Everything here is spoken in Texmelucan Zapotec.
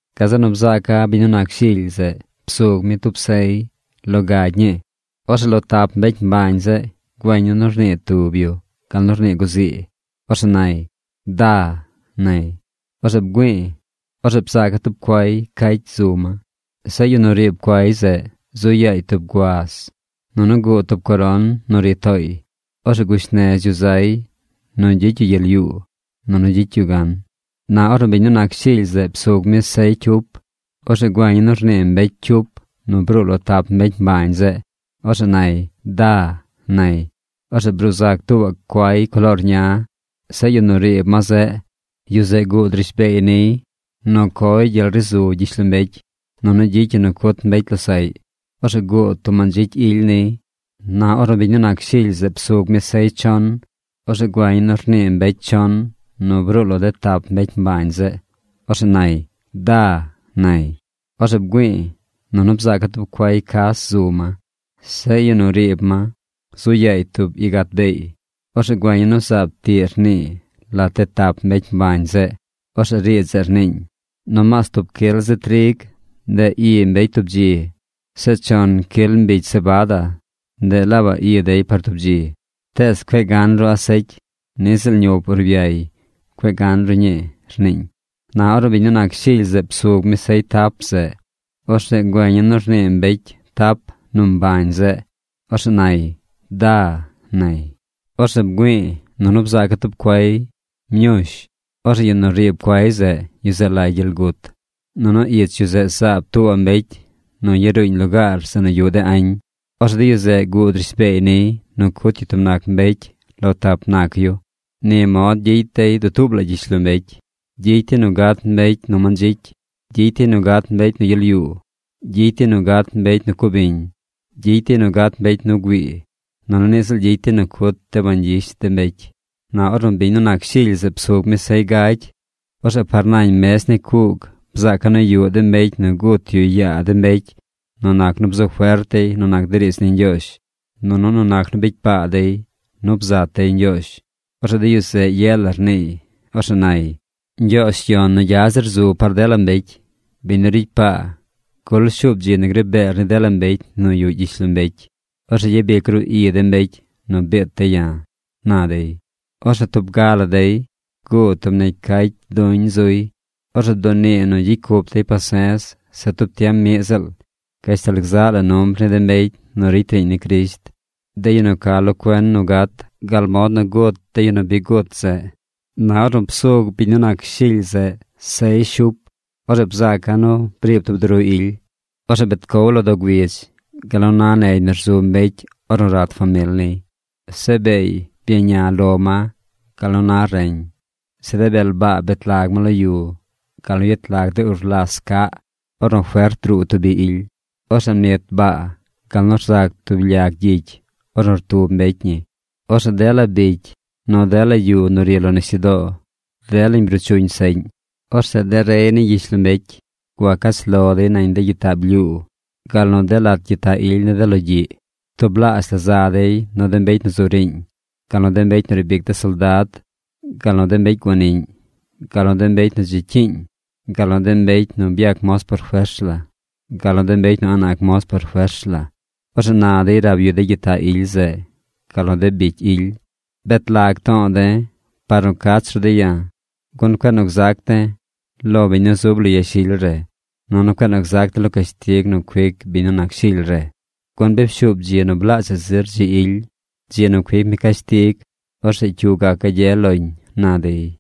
Gazeꞌ nu bzaaca̱ biñ nu nac Shily zeꞌ psug mi tub sey lo gagy ñii. Orzeꞌ lo tap mbecy mbañ zeꞌ güeña̱ nu rnii tub yu gal nu rnii guzii. Orzeꞌ nay: ―¡Da! ―nay. Orzeꞌ bgüi̱i̱. Orzeꞌ bzaaca̱ tub cuay cacy zu ma. Zeꞌ yu nu riib cuay zeꞌ zu yaay tub guaz. Nunu guud tub coron nu ri tooy. Orzeꞌ gush nez yu zay nu gyicy yu gyel yuu, nunu gyicy yu gan. Na ornu biñ nu nac Shily zeꞌ psug mi sey cyup, orzeꞌ güeña̱ nu rnii mbecy cyup nu bruu lo tap mbecy mbañ zeꞌ. Orzeꞌ nay: ―¡Da! ―nay. Orzeꞌ bruu zac tuubaꞌ cuay coloor ña. Zeꞌ yu nu riib ma zeꞌ, yu zeꞌ guud rishbeey niy nu coy gyel ri zu gyishlombecy, nunu gyicy yu nu cut mbecy losaꞌy. Orzeꞌ guud tub mandzicy ily niy. Na ornu biñ nu nac Shily zeꞌ psug mi sey chon, orzeꞌ güeña̱ nu rnii mbecy chon nu bruu lo de tap mbecy mbañ zeꞌ. Orzeꞌ nay: ―¡Da! ―nay. Orzeꞌ bgüi̱i̱, nunu bzaaca̱ tub cuay cas zu ma. Zeꞌ yu nu riib ma zu yaay tub igat beey. Orzeꞌ güeña̱ nu zaab tiꞌ rnii lat de tap mbecy mbañ zeꞌ. Orzeꞌ riidz zeꞌ rniiñ: ―Nomaas tub cyil zi trig, ndeꞌ i mbecy tub dzi. Zeꞌ chon cyil mbigy sebada, ndeꞌ laabaꞌ i dey par tub dzi. Tees cueꞌ gan ru asecy. Niꞌ ziꞌl ñup urbyay cueꞌ gan ru ñii ―rniiñ. Na ornu biñ nu nac Shily zeꞌ psug mi sey tap zeꞌ, orzeꞌ güeña̱ nu rnii mbecy tap nu mbañ zeꞌ. Orzeꞌ nay: ―¡Da! ―nay. Orzeꞌ bgüi̱i̱, nunu bzaaca̱ tub cuay mñush. Orzeꞌ yu nu riib cuay zeꞌ, yu zeꞌ lay Gyel Gut. Nunu ich yu zeꞌ zaab tuubaꞌ mbecy nu yaruuñ lugaar zeꞌ nu yuꞌ de añ. Orzeꞌ de yu zeꞌ guud rishbeey niy nu cut yu tub nac mbecy lo tap nac yu. Ni mod gyicy dey dutuub la gyishlombecy. Gyicy dey nu gat mbecy nu mandzicy. Gyicy dey nu gat mbecy nu gyel yuu. Gyicy dey nu gat mbecy nu cubiñ. Gyicy dey nu gat mbecy nu güii. Nunu niꞌ ziꞌl gyicy dey nu cut de bañ gyish de mbecy. Na ornu biñ nu nac Shily zeꞌ psug mi sey gay, orzeꞌ par nañ mez ni cuug bzaaca̱ nu yuꞌ de mbecy nu gut yu yaa de mbecy nu nac nu bzu fert dey nu nac de riidz ni Ñgyoozh, nunu nu nac nu bicy paa dey nu bzat dey Ñgyoozh. Orzeꞌ de yu zeꞌ ye la rniiy. Orzeꞌ nay: ―Ñgyoozh yon nu gya zir zu par dela mbecy, biñ nu ricy paa, ¿gul shuub dzi nu gri beer ni dela mbecy nu yuꞌ gyishlombecy? Orzeꞌ gyabic ru i de mbecy nu biit de̱ ya̱ ―na dey. Orzeꞌ tub ga la dey guud tub negy cacy duñ zuy. Orzeꞌ bdunii nu gyicy cup dey pase̱z se tub tiem miꞌ ziꞌl, gashtal gzaꞌ la numbr ni de mbecy nu ricy riiñ ni Crisht, de yu nu ca lo cuen nu gat gal mod nu gut de yu nu bi gut zeꞌ. Na ornu psug biñ nu nac Shily zeꞌ sey shup, orzeꞌ bzaaca̱ nu briib tub duru ily. Orzeꞌ bet cow lo doo güidz gal nu na negy nu rzu mbecy ornu rat famil niy. Zeꞌ beey byaña lo ma gal nu na reñ. Zeꞌ de bel baa bet lag ma lo yu gal nu yet lag de urlas caꞌ ornu fert druu tub bi ily. Orzeꞌ mnit baa gal nu rzac tub lyag gyicy ornu rtub mbecy ñi. Orzeꞌ dela bicy nu dela yu nu ri lo nisyudoo, delañ bruu chuñ seꞌñ. Orzeꞌ de rey ni gyishlombecy gua cach lo dey nañ de gyitaꞌ blyuu gal nu de lat gyitaꞌ ily ni de logyiꞌ. Tublaazh la za dey nu de mbecy nu zu riiñ, gal nu de mbecy nu riib ic de soldad, gal nu de mbecy guaniꞌñ, gal nu de mbecy nu dzi cyiiñ, gal nu de mbecy nu byac moz por fers la, gal nu de mbecy nu a̱ꞌ nac moz por fers la. Orzeꞌ na dey rab yu de gyitaꞌ ily zeꞌ, gal nu de bicy ily: ―¡Bet lag to̱o̱ de̱ par nu cach ru de̱ ya̱, gun cueꞌ nu gzac de̱ lo biñ nu zub lo yashily re, nunu cueꞌ nu gzac de̱ lo cashtig nu cuic biñ nu nac Shily re! Gun bi pshuub dzi nu blaazhaꞌ zir dzi ily, dzi nu cuic mi cashtig. Orzeꞌ ¿cyu gac gagye loñ? ―na dey.